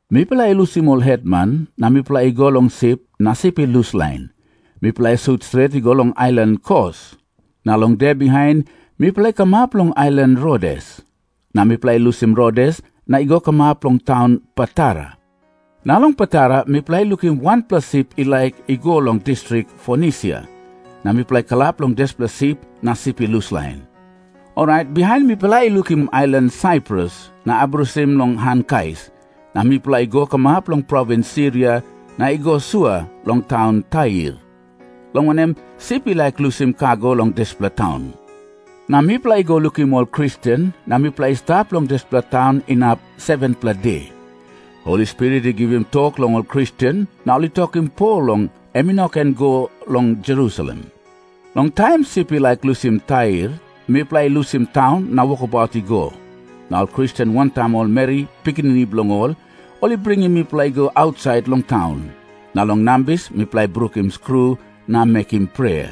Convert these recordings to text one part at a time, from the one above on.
Mipela i lusim ol hetman, na mipela i go long sip na sip i luslain. Mipela i sut stret i go long ailan Kos. Na long de bihain mipela i kamap long ailan Rodes. Na mipela i lusim Rodes na i go kamap long taun Patara. Na long Patara mipela i lukim wanpela sip i laik i go long distrik Fonisia, na mipela i kalap long dispela sip na sip i luslain. Orait bihain mipela i lukim ailan Saiprus na abrusim long han kais. Na mipela i go kamap long provins Siria na i go sua long taun Tair, long wanem, sip i laik lusim kago long dispela taun. Na mipela i go lukim ol Kristen, na mipela i stap long dispela taun inap 7-pela de. Holi Spirit i givim tok long ol Kristen, na ol i tokim Pol long em i no ken i go long Jerusalem. Long taim sip i laik lusim Tair, mipela i lusim taun na wokabaut i go. Na ol Kristen wantaim ol meri pikinini bilong ol, ol i bringim mipela i go ausait long taun. Na long nambis mipela i brukim skru na mekim prea.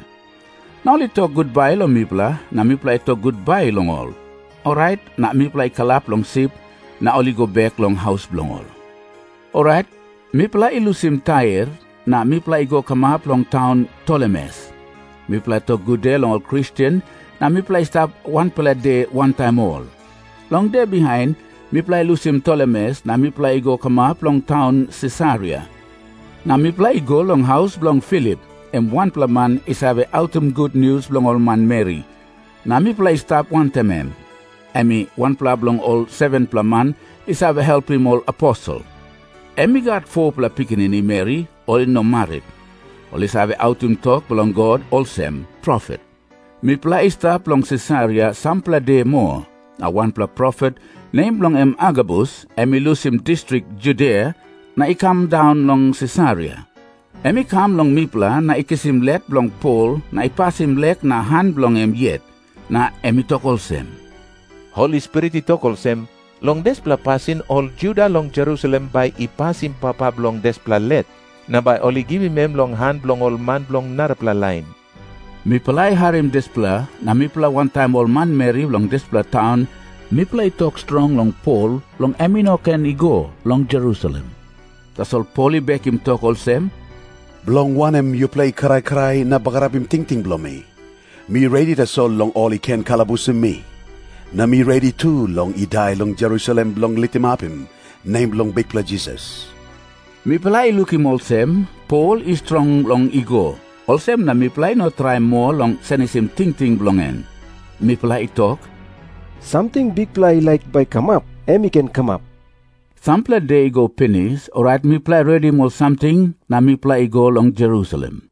Na ol i tok gutbai long mipela, na mipela i tok gutbai long ol. Orait na mipela i kalap long sip, na ol i go bek long haus bilong ol. Orait mipela i lusim Tair, na mipela i go kamap long taun Tolemes. Mipela i tok gude long ol Kristen, na mipela i stap wanpela de wantaim ol. Long de bihain mipela i lusim Tolemes na mipela i go kamap long taun Sisaria. Na mipela i go long haus bilong Filip, em wanpela man i save autim gutnius long ol manmeri, na mipela i stap wantaim em. Em i wanpela bilong ol 7-pela man i save helpim ol aposel. Em i gat 4-pela pikinini meri ol i no marit. Ol i save autim tok bilong God olsem profet. Mipela i stap long Sisaria sampela de moa, na wanpela profet, nem bilong en Agabus, em i lusim distrik Judia na i kam daun long Sisaria. Em i kam long mipela na i kisim let bilong Pol na i pasim lek na han bilong em yet. Na em i tok olsem, "Holi Spirit i tok olsem, 'Long dispela pasin ol Juda long Jerusalem bai I pasim papa bilong dispela let, na bai ol i givim em long han bilong ol man bilong narapela lain.'" Mipela i harim dispela, na mipela wantaim ol manmeri bilong dispela taun mipela i tok strong long Pol, long em i no ken i go long Jerusalem. Tasol Pol i bekim tok olsem, "Bilong wanem yupela i krai krai na bagarapim tingting bilong mi? Mi redi tasol long ol i ken kalabusim mi. Na mi redi tu long i dai long Jerusalem bilong litimapim nem bilong Bikpela Jisas." Mipela i lukim olsem Pol i strong long i go, olsem na mipela i no traim moa long senisim tingting bilong en. Mipela i tok, "Samting Bikpela I laik bai i kamap, em i ken kamap." Sampela de i go pinis, orait mipela i redim ol samting na mipela i go long Jerusalem.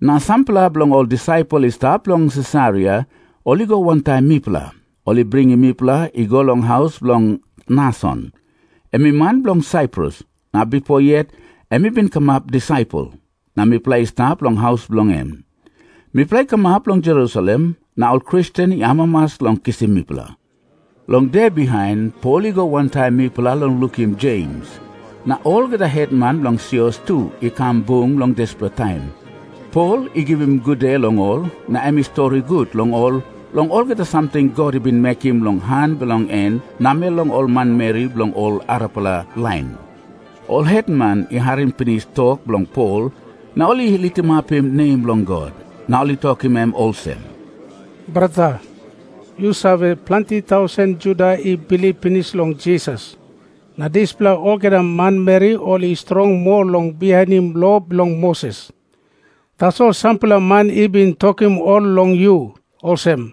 Na sampela bilong ol disaipel i stap long Sisaria ol i go wantaim mipela. Ol i bringim mipela i go long haus bilong Nason, em i man bilong Saiprus, na bipo yet em i bin kamap disaipel. Na mipela i stap long haus bilong en. Mipela i kamap long Jerusalem, na ol Kristen i amamas long kisim mipela. Long de bihain Pol i go wantaim mipela long lukim Jems. Na olgeta hetman bilong sios tu i kam bung long dispela taim. Pol i givim gude long ol, na em i stori gut long ol long olgeta samting God i bin mekim long han bilong en namel long ol manmeri bilong ol arapela lain. Ol hetman i harim pinis tok bilong Pol, na ol i litimapim nem bilong God. Na ol i tokim em olsem, "Brata, yu save, planti tausen Juda i bilip pinis long Jisas. Na dispela olgeta manmeri ol i strong moa long bihainim lo bilong Moses. Tasol sampela man i bin tokim ol long yu, olsem,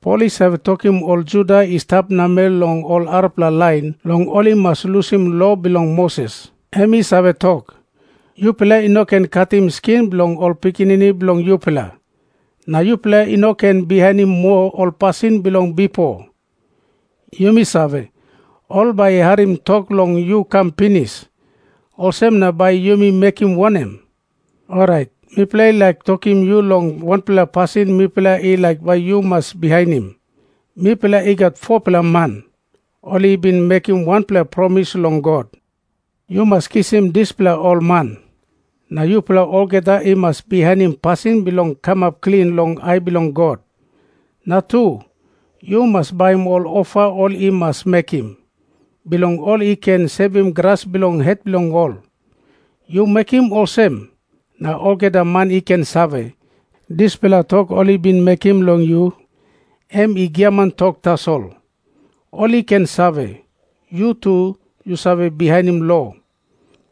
'Pol i save tokim ol Juda i stap namel long ol arapela lain long ol i mas lusim lo bilong Moses. Em i save tok, "Yupela i no ken katim skin bilong ol pikinini bilong yupela. Na yupela i no ken bihainim moa ol pasin bilong bipo.'" Yumi save, ol bai i harim tok long yu kam pinis. Olsem na bai yumi mekim wanem? Orait mipela i laik tokim yu long wanpela pasin mipela i laik bai yu mas bihainim. Mipela i gat 4-pela man, ol i bin mekim wanpela promis long God. Yu mas kisim dispela ol man, na yupela olgeta i mas bihainim pasin bilong kamap klin long ai bilong God. Na tu, yu mas baim ol ofa ol i mas mekim, bilong ol i ken sevim gras bilong het bilong ol. Yu mekim olsem, na olgeta man i ken save, dispela tok ol i bin mekim long yu, em i giaman tok tasol. Ol i ken save, yu tu yu save bihainim lo.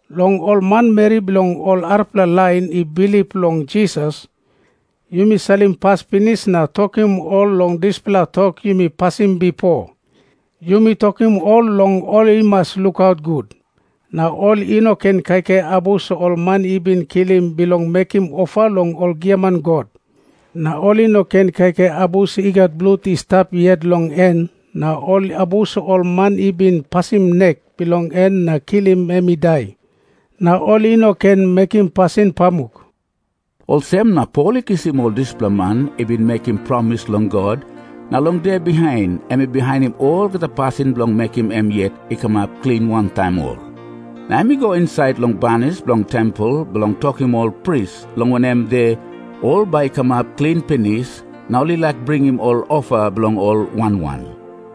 Long ol manmeri bilong ol arapela lain i bilip long Jisas, yumi salim pas pinis na tokim ol long dispela tok yumi pasim bipo. Yumi tokim ol long ol i mas lukaut gut, na ol i no ken kaikai abus ol man i bin kilim bilong mekim ofa long ol giaman god, na ol i no ken kaikai abus i gat blut i stap yet long en na ol abus ol man i bin pasim nek bilong en na kilim em i dai, na ol i no ken mekim pasin pamuk." Olsem na Pol i kisim ol dispela man i bin mekim promis long God, na long de bihain em i bihainim olgeta pasin bilong mekim em yet i kamap klin wantaim ol. Na em i go insait long banis bilong tempel bilong tokim ol pris long wanem de ol bai i kamap klin pinis na ol i laik bringim ol ofa bilong ol wan wan.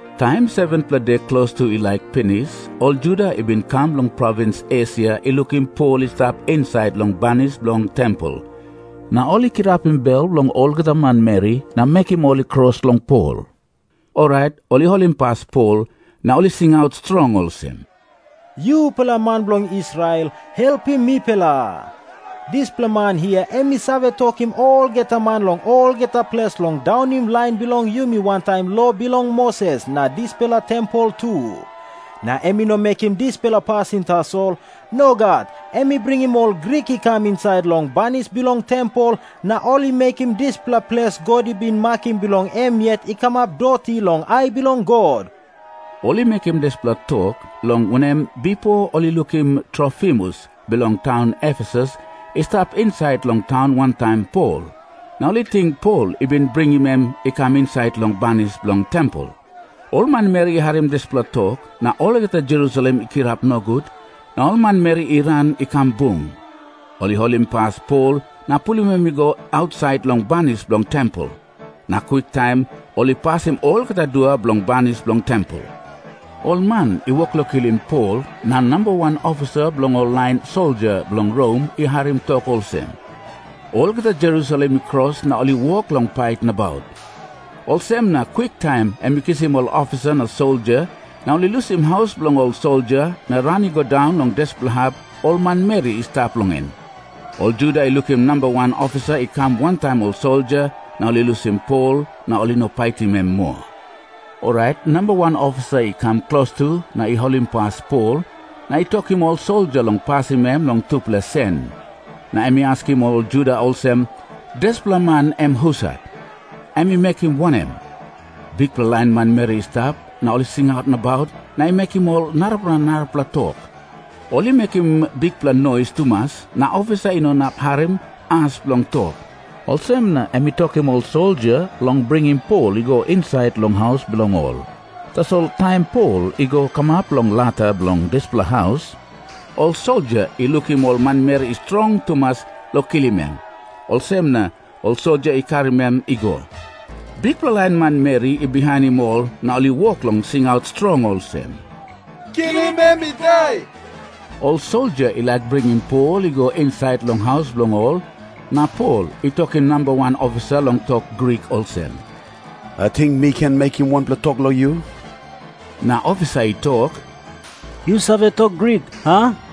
Taim 7-pela de klostu i laik pinis, ol Juda i bin kam long provins Esia i lukim Pol i stap insait long banis bilong tempel, na ol i kirapim bel bilong olgeta manmeri na mekim ol i kros long Pol. Orait ol i holimpas Pol, na ol i singaut strong olsem, "Yupela man bilong Israel, helpim mipela. Dispela man hia em i save tokim olgeta man long olgeta ples long daunim lain bilong yumi wantaim lo bilong Moses na dispela tempel tu. Na em i no mekim dispela pasin tasol. Nogat. Em i bringim ol Grik i kam insait long banis bilong tempel na ol i mekim dispela ples God i bin makim bilong em yet i kamap doti long ai bilong God." Ol i mekim dispela tok, long wanem, bipo ol i lukim Trofimus bilong taun Efesus i stap insait long taun wantaim Pol, na ol i ting Pol i bin bringim em i kam insait long banis bilong tempel. Ol manmeri i harim dispela tok, na olgeta Jerusalem i kirap nogut, na ol manmeri i ran i kam bung. Ol i holimpas Pol na pulim em i go ausait long banis bilong tempel. Na kwiktaim ol i pasim olgeta dua bilong banis bilong tempel. Ol man i wok long kilim Pol, na namba wan ofisa bilong ol lain soldia bilong Rom i harim tok olsem, "Olgeta Jerusalem i kros na ol i wok long pait nabaut." Olsem na kwiktaim em i kisim ol ofisa na soldia na ol i lusim haus bilong ol soldia na ran i go daun long dispela hap ol manmeri i stap long en. Ol Juda i lukim namba wan ofisa i kam wantaim ol soldia, na ol i lusim Pol na ol i no paitim em moa. Orait namba wan ofisa i kam klostu na i holimpas Pol, na i tokim ol soldia long pasim em long tupela sen. Na em i askim ol Juda olsem, "Dispela man, em husat? Em i mekim wanem?" Bikpela lain manmeri i stap, na ol i singaut nabaut na i mekim ol narapela narapela tok. Ol i mekim bikpela nois tumas, na ofisa i no inap harim as bilong tok. Olsem na em i tokim ol soldia long bringim Pol i go insait long haus bilong ol. Tasol taim Pol i go kamap long lata bilong dispela haus, ol soldia i lukim ol manmeri i strong tumas long kilim em, olsem na ol soldia i karim em i go. Bikpela lain manmeri i bihainim ol na ol i wok long singaut strong olsem, "Kilim em i dai." Ol soldia i laik bringim Pol i go insait long haus bilong ol, na Pol i tokim namba wan ofisa long tok Grik olsem, "Ating mi ken mekim wanpela tok long yu?" Na ofisa i tok, "Yu save tok Grik, a?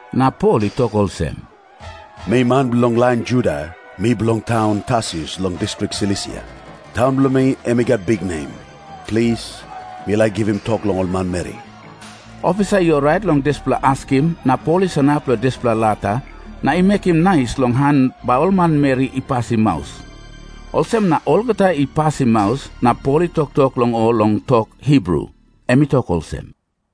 Na Pol i tok olsem, "Mi man bilong lain Juda. Mi bilong taun Tarsus long distrik Silisia. Taun bilong mi em i gat biknem. Plis, mi laik givim tok long ol manmeri." Ofisa i orait long dispela askim, na Pol i sanap long dispela lata na i mekim nais long han bai ol manmeri I pasim maus. Olsem na olgeta ol i pasim maus, na Pol i toktok long ol long tok Hibru. Em i tok olsem,